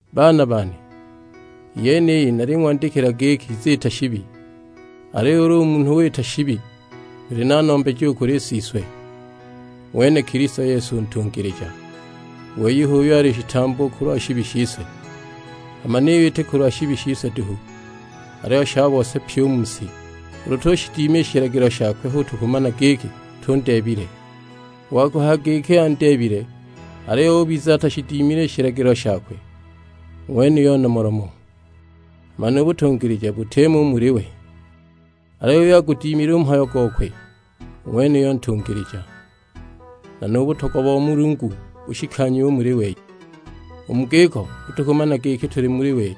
Baana bane, i yeniyi naling'wandikila giki mutiziita shibi; aliyo ulu munhu wita shibi tuli na Nombeji u kuli Siswe, ng'wene Kilisto Yesu u ntungilija. U wei h'uyo ali shitambo kulwa shibi shise, hama niyo iti kulwa shibi shise duhu, aliyo sha bose pyi u mu si. Ulu tushidima i shilagilo shakwe hu tukumana giki tundeebile. U wa kuhaya giki andeebile aliyo ubiza atashidimile i shilagilo shakwe, u ng'wenuyo nomolomo; hama nu butungilija butimo u muli we. Aliyo uyo agudimile u mhayo gokwe, u ng'wenuyo ntungilija, nu butogwa bo ng'wa Mulungu bushikanyiwe u muli we. U mu giko hu tukumana giki tuli muli we.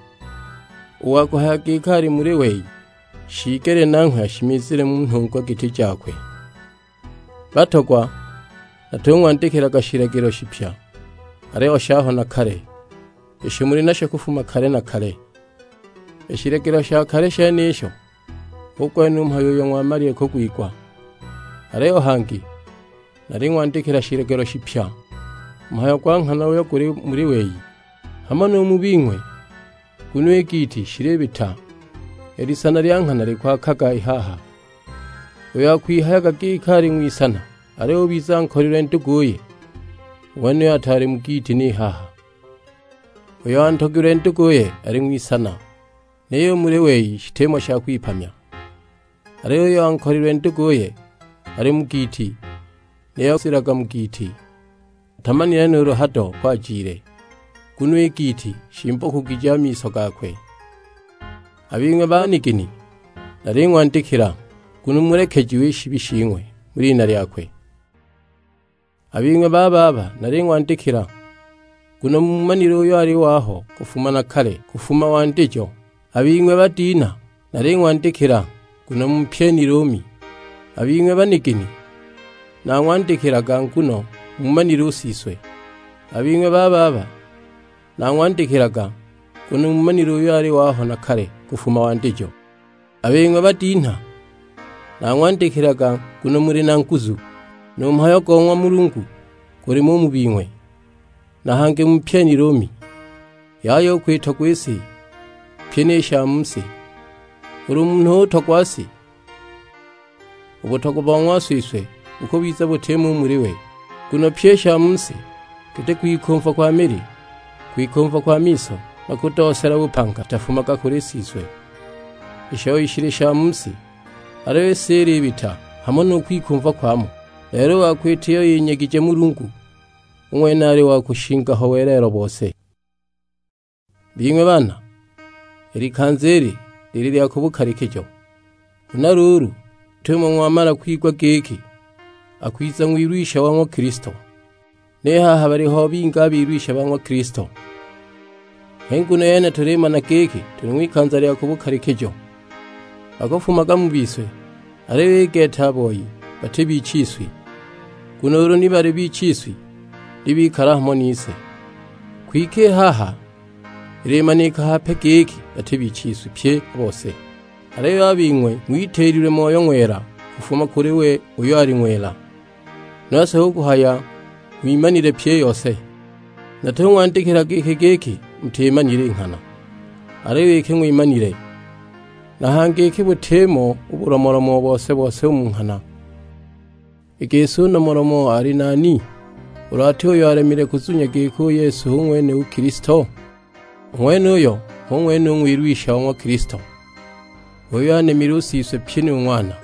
U wa kuhaya giki ali muli wei, shiigelile nanghwe ashimizile mu nhungwa giti jakwe. Batogwa, natung'wandikilaga shilagilo shipya, aliyo shaho na kale; isho muli nasho kufuma kale na kale. I shilagilo sha kale shenisho hu gwene u mhayo uyo ng'wamalile kugwigwa. Aliyo hangi naling'wandikila shilagilo shipya, u mhayo gwa nghana uyo guli muli wei, hamo nu mu bing'we; nguno i giiti shilibita, i lisana lya nghana likwaakaga i haha. Uyo akwihayaga giki ali ng'wisana aliyo ubiza ankolilwe nduguye, u ng'wenuyo ataali mu giiti ni haha! Uyo antogilwe nduguye ali ng'wisana, niyo u muli wei shitimo sha kwipamya. Aliyo uyo ankolilwe nduguye ali mu giiti, niyo akushimizilaga mu giiti; atamanile nuulu hado uko ajile, nguno i giiti shimbokugije a miso gakwe! A bing'we banigini naling'wandikila, nguno mulekejiwe i shibi shing'we mu lina lyakwe. A bing'we bababa naling'wandikila, nguno muumanile uyo ali waho na kale, kufuma wandijo. A bing'we badinha, naling'wandikila, nguno mumpyenile u Mi. A bing'we banigini, nang'wandikilaga, nguno muumanile u Siswe. A bing'we bababa, nang'wandikilaga, nguno muumanile uyo ali waho na kale kufuma wandijo. A bing'we badinha, nang'wandikilaga, nguno muli na nguzu, nu mhayo go ng'wa Mulungu gulimo u mu bing'we, na hangi mumpyenile u Mi. Yaya u kwitogwa i si, pyi ni sha mu si; ulu munhu utogwa si, u butogwa bo ng'wa Siswe bukubiza butimo u muli we. Nguno pyi i sha mu si, giti kwikumva kwa mili, kwikumva kwa miso, na kudoosela bupanga; shitafumaga kuli Siswe, i shoi shili sha mu si! Aliyo i si ilibita, hamo nu kwikumva kwamo; lelo u wa kwita iyo yinyegije Mulungu, u ng'wene ali wa kushinga ho welelo bose. Bing'we baana, i likanza ili lili lya ku bukalikijo; huna luulu git'umo ng'wamala kwigwa giki akwiza Ng'wilwisha wa ng'wa Kilisto, ni haha baliho bingi a bilwisha ba ng'wa Kilisto. H'i nguno yene tulimana giki tuli ng'wikanza lya ku bukalikijo. Bakufumaga mu bise, aliyo i gete a boi bati bichiswi, nguno ulu ni baali bichiswi ni bikala hamo nise, kwike i haha ilimanika hape giki bati bichiswi pye a bose! Aliyo a bing'we ng'witiililwe Moyo Ng'wela kufuma kuli we uyo ali ng'wela, nose hu kuhaya ng'wimanile pyi i yose. Natung'wandikilaga iki giki mutimanile i nghana, aliyo iki ng'wimanile; na hangi iki butimo bulomolomo bose-bose u mu nghana. I gisi u nomolomo ali nani, ulu ati uyo alemile kuzunya giki u Yesu hu ng'wene u Kilisto? U ng'wenuyo hu ng'wene u Ng'wilwisha wa ng'wa Kilisto, h'uyo anemile u Siswe pyi nu Ng'wana!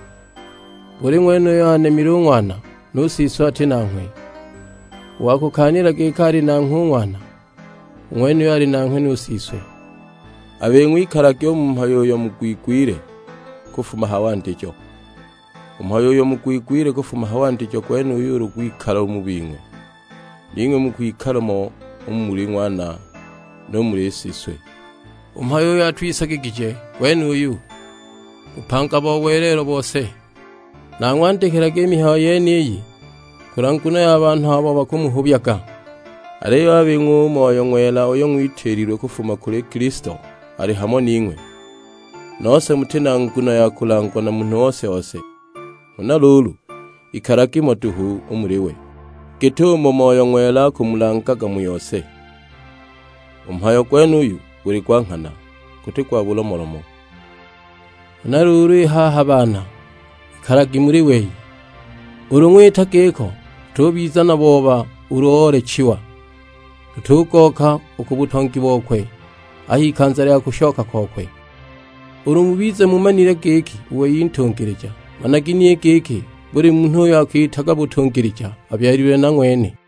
Buli ng'wene uyo anemile u Ng'wana, nu Siswe ati nanghwe; u wa kukaanila giki ali nanghwe u Ng'wana, u ng'wenuyo ali nanghwe nu Siswe. A bing'we ikalagi u mu mhayo uyo mugwigwile kufuma ha wandijo. U mhayo uyo mugwigwile kufuma ha wandijo gwenuyo ulu gwikala u mu bing'we, ning'we mukwikala mo u muli Ng'wana nu muli Siswe. U mhayo uyo atwisagigije gwene uyu, bupanga bo welelo bose. Nang'wandikilaga i mihayo yeniyi kulwa nguno ya banhu abo bakumuhubyaga. Aliyo a bing'we u Moyo Ng'wela uyo ng'witiililwe kufuma kuli Kilisto ali hamo ning'we, nose muti na nguno ya kulangwa na munhu ose-ose. Huna luulu ikalagi mo duhu u muli we, git'umo Moyo Ng'wela akumulangaga mu yose. U mhayo gwenuyu guli gwa nghana, guti gwa bulomolomo. Huna luulu i haha baana, ikalagi muli wei. Ulu ng'wita giko tutubiza na booba ulu oolechiwa, tutugooka u ku butongi bokwe a h'ikanza lya kushoka kwakwe. Ulu mubize mumanile giki u wei ntungilija, managi ni giki buli munhu uyo akiitaga ya butungilija abyalilwe na ng'wene.